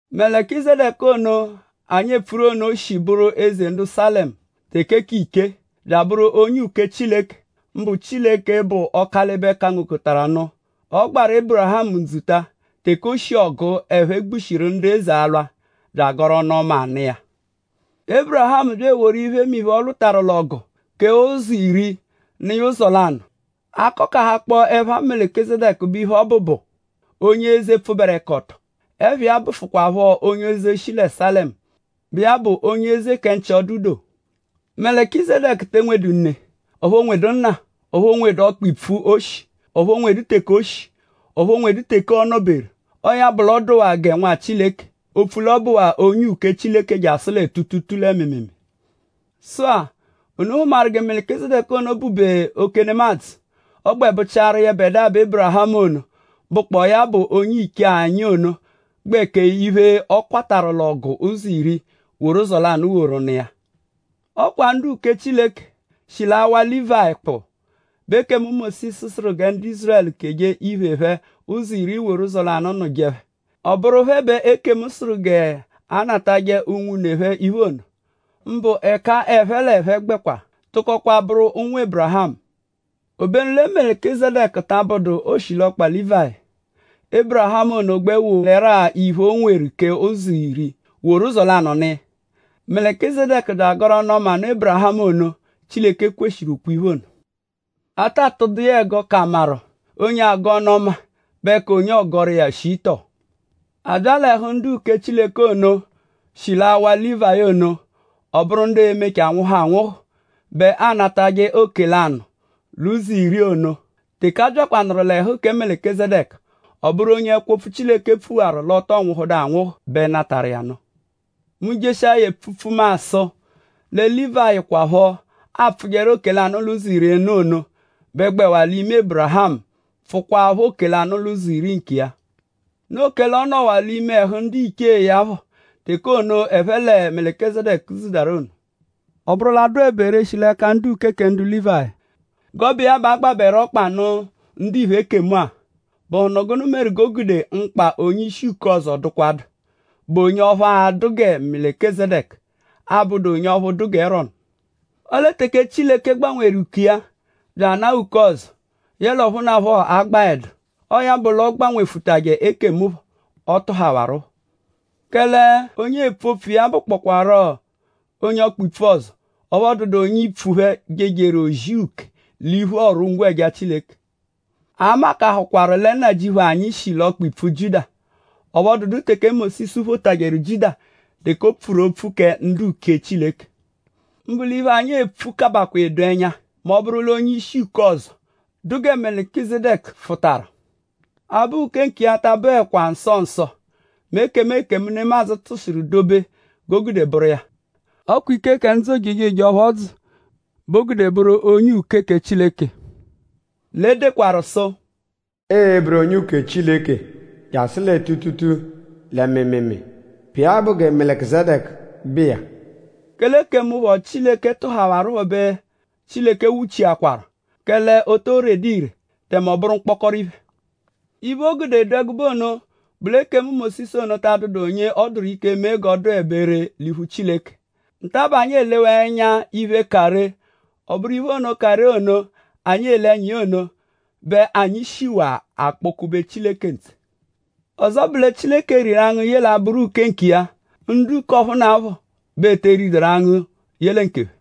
Melikizedeku ono, anyi epfuru ono shi bụru eze ndu Salemu teke k'ichee; bya abụru onye uke Chileke; mbụ Chileke, bụ Ọkalibe-kangokọtaru-nụ. Ọ gbaru Ébirihamu ndzuta teke o shi ọgu, ẹphe gbushiru ndu eze alwa; bya agọru ọnu-ọma nụ iya. Ébirihamu bya eworu iphemiphe, ọ lwụtaru l'ọgu; kee ụzo iri; nụ iya ụzo lanụ. A -kọkahakpo ẹpha Melikizedeku bẹ iphe mbụ, ọ bụ bụ: “Onye eze, pfụberekoto.” Ẹpha iya bụfukwaapho Onye eze, shi lẹ Salemu, bụ iya bụ Onye eze kẹ nchị-ọdu-doo. Melikizedeku te enwedu ne; ọphu o nwedu nna; ọphu o nwedu ọkpa-ipfu, o shi; ọphu o nwedu teke o shi; ọphu o nwedu teke ọ nọ-beru. Ọo ya bụ l'ọ dụwaa gẹ Nwa Chileke; opfu l'ọ bụwaa onye uke Chileke jasụ lẹ tuutuutuu lẹ mịimiimii. Sụ-a;?unu hụmaru gẹ Melikizedeku ono bụ-be oke nemadzụ; ọ gbẹ bụchiaru yẹbedua bẹ Ébirihamu ono, bụkpoo ya bụ onye-iche anyi ono gbẹ kee iphe, ọ kwatarụ l'ọgu ụzo iri; woru uzi lanụ woru nụ iya. Ọ kwa ndu-uke Chileke, shi l'awa Lívayi kpụ bẹ ekemu Mósisu sụru gẹ ndu Ízurẹlu keje iphe phẹ ụzo iri woru uzi lanụ nụje phẹ. Ọ bụru phẹ bẹ ekemu sụru g'ẹphe natajẹ unwune phẹ iphe ono; mbụ ẹka ẹphe l'ẹphe gbẹkwa tụkokwaa bụru ụnwu Ébirihamu. Obenu lẹ Melikizedeku ta abụdu oshilọkpa Lívayi. Ébirihamu ono gbẹ wolẹru-a iphe, o nweru kee ụzo iri; woru uzi lanụ nụ iya. Melikizedeku bya agọru ọnu-ọma nụ Ébirihamu ono, Chileke kweshiru ukwe-iphe ono. A ta tụdu iya ẹgo k'amaru:?onye agọ ọnu-ọma bẹ ka onye ọogoru iya shii tọo. A bya l'ẹhu ndu-uke Chileke ono, shi l'awa Lívayi ono; ọ bụru ndu e-mechaa nwụhu anwụhu bẹ anatajẹ oke-lanụ-l'ụzo-iri ono. Teke a byakwanụru l'ẹhu kẹ Melikizedeku; ọ bụru onye ẹkwo-opfu Chileke pfuwaru l'ọ tọo nwụhudu anwụhu bẹ natarụ iya nụ. Mu -jeshia ya epfupfu mu asụ lẹ Lívayi kwaphọ, aapfụjeru oke-lanụ-l'ụzo-iri nụ ono bẹ gbẹwaa l'ime Ébirihamu pfụkwapho oke-lanụ-l'ụzo-iri nkiya. Noo kẹle ọ nọwaa l'ime ẹhu ndiche iya phẹ teke ono, ẹphe lẹ Melikizedeku dzudarụ ono. Ọ -bụru l'adụebe ree shi l'ẹka ndu-uke kẹ ndu Lívayi; g'ọ bụ iya bẹ a gbabẹru ọkpa nụ ndiphe ekemu-a;?bụhunu gụnu meru g'o gude mkpa onye-ishi uke ọzo dụkwadu, bụ onye ọphu a-dụ gẹ Melikizedeku, abụdu onye ọphu dụ gẹ Erọnu? Ọle teke Chileke gbanwewaru uke iya bya anaa uke ọzo, yẹle ọphunapho agbaẹdu; ọo ya bụ l'ọ gbanwefụtaje ekemu phọ, ọ tụhawaru phọ. Kẹle onye eepfu opfu iya-a bụkpokwaro onye ọkpa-ipfu ọzo; ọphu ọ dụdu onye ipfu phẹ, jejeru ozi uke l'iphu ọru-ngwẹja Chileke. A makahakwaru lẹ Nnajịuphu anyi shi l'ọkpa-ipfu Jiuda. Ọphu ọ dụdu teke Mósisu photajẹru Jiuda teke o pfuru opfu kẹ ndu-uke Chileke. Mbụ l'iphe, anyi epfu kabakwaa edo ẹnya; mẹ ọ -bụru l'onye-ishi uke ọzo, dụ gẹ Melikizedeku fụtaru. Abụ uke nkiya ta abụekwa nsọ nsọ mẹ ekemu ekemu, nemadzụ tụshiru dobe bẹ o gude bụru iya. Ọ kwa ike kẹ ndzụ ojejoje ọphu ọ dzụ bẹ o gude bụru onye uke Chileke. L'e dekwaru sụ: “Ịi-bụru onye uke Chileke jasụ lẹ tuutuutuu lẹ mịimiimii, bụ iya bụ gẹ Melikizedeku bụ iya.” Kẹle ekemu phọ, Chileke tụhawarupho bẹ Chileke nwuchiakwaru; kẹle o too redu ire; tẹme ọ bụru mkpọkoro iphe. Iphe, o gude ọ dụ ẹgube ono bụ l'ekemu Mósisu ono ta adụdu onye ọ dụru ike mee g'ọ dụebe ree l'iphu Chileke. Nta-a bẹ anyi elewaa ẹnya iphe, ka ree. Ọ bụru iphe ono, ka ree ono, anyi ele ẹnya iya ono bẹ anyi shiwaa akpọ-kube Chileke ntse. Ọzo bụ lẹ Chileke riru angụ ye l'abụru onye uke nkiya. Ndu uke k'ọphunapho bẹ e te riduru angụ ye lẹ nkephẹ.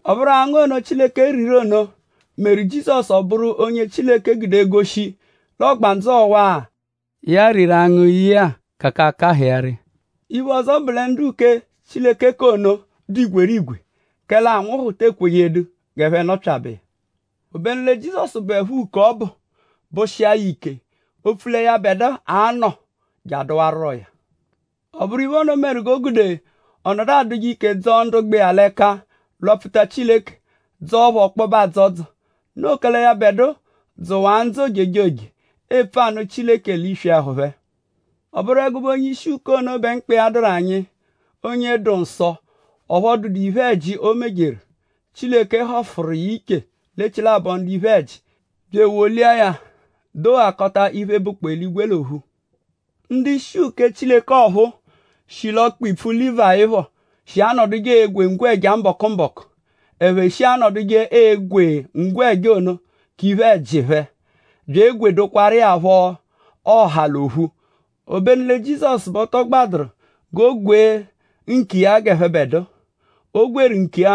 Ọ bụru angụ ono, Chileke riru ono meru Jizọsu ọ bụru onye Chileke gude egoshi l'ọgbandzu ọwa-a, ya riru angụ ye-a ka akahụ iya ree. Iphe ọzo bụ lẹ ndu-uke Chileke k'ono dụ igwerigwe kẹle anwụhu te ekwejedu g'ẹphe nọpyabe iya. Obenu lẹ Jizọsu bụepho uke, ọ bụ; bụshia ya ike; opfu lẹ yẹbedua a-nọ je adụwaruroya. Ọ bụru iphe ono meru g'o gude ọ nọdu adụje ike dzọo ndu gbẹ iya l'ẹka lwapfuta Chileke; dzọo phẹ ọkpobe adzọdzo; noo kẹle yẹbedua dzụwaa ndzụ ojejoje epfuje anụ Chileke l'iswi ẹhu phẹ. Ọ bụru ẹgube onye-ishi-uke ono bẹ mkpa iya dụru anyi; onye dụ nsọ ọphu ọ dụdu iphe-ẹji, o mejeru. Chileke họfuru iya iche l'echilabọ ndu iphe-ẹji bya ewolia ya doghakọta iphe, bụkpoo eligwe l'ophu. Ndu-ishi uke Chileke ọphuu, shi l'ọkpa-ipfu Lívayi phọ shi anọduje egwe ngwẹja mbọku-mbọku. Ẹphe shi anọduje egwe ngwẹja ono k'iphe-ẹji phẹ bya egwedokwaru iya phọ ọha l'ophu. Obenu lẹ Jizọsu bẹ ọ tọ gbadụru g'o gwee nkiya g'ẹphebedua. O gwerụ nkiya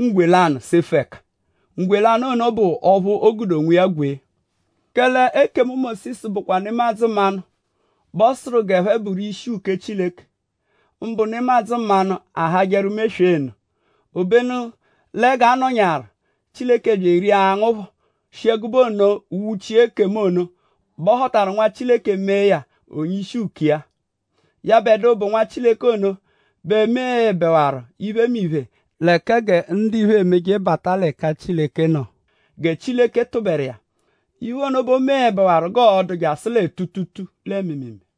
ngwe lanụ sefu ẹka. Ngwe lanụ ono bụ ọphu o gude onwiya gwee. Kẹle ekemu Mósisu bụkwa nemadzụ mmanụ bẹ ọ sụru g'ẹphe bụru ishi uke Chileke; mbụ nemadzụ mmanụ, ahajẹru meswee nụ. Obenu lẹ g'a nọnyaaru Chileke bya eria angụ phọ shi ẹgube ono nwuchi ekemu ono bẹ ọ họtaru Nwa Chileke mee ya onye-ishi uke iya. Yẹbedua, bụ Nwa Chileke ono bẹ meẹbewaru iphemiphe lẹ kẹ gẹ ndiphe e-meje bata l'ẹka Chileke nọ; gẹ Chileke tụberu iya. Iphe ono bẹ o meẹbewaru g'ọo-dụ jasụ lẹ tuutuutuu lẹ mịimiimii.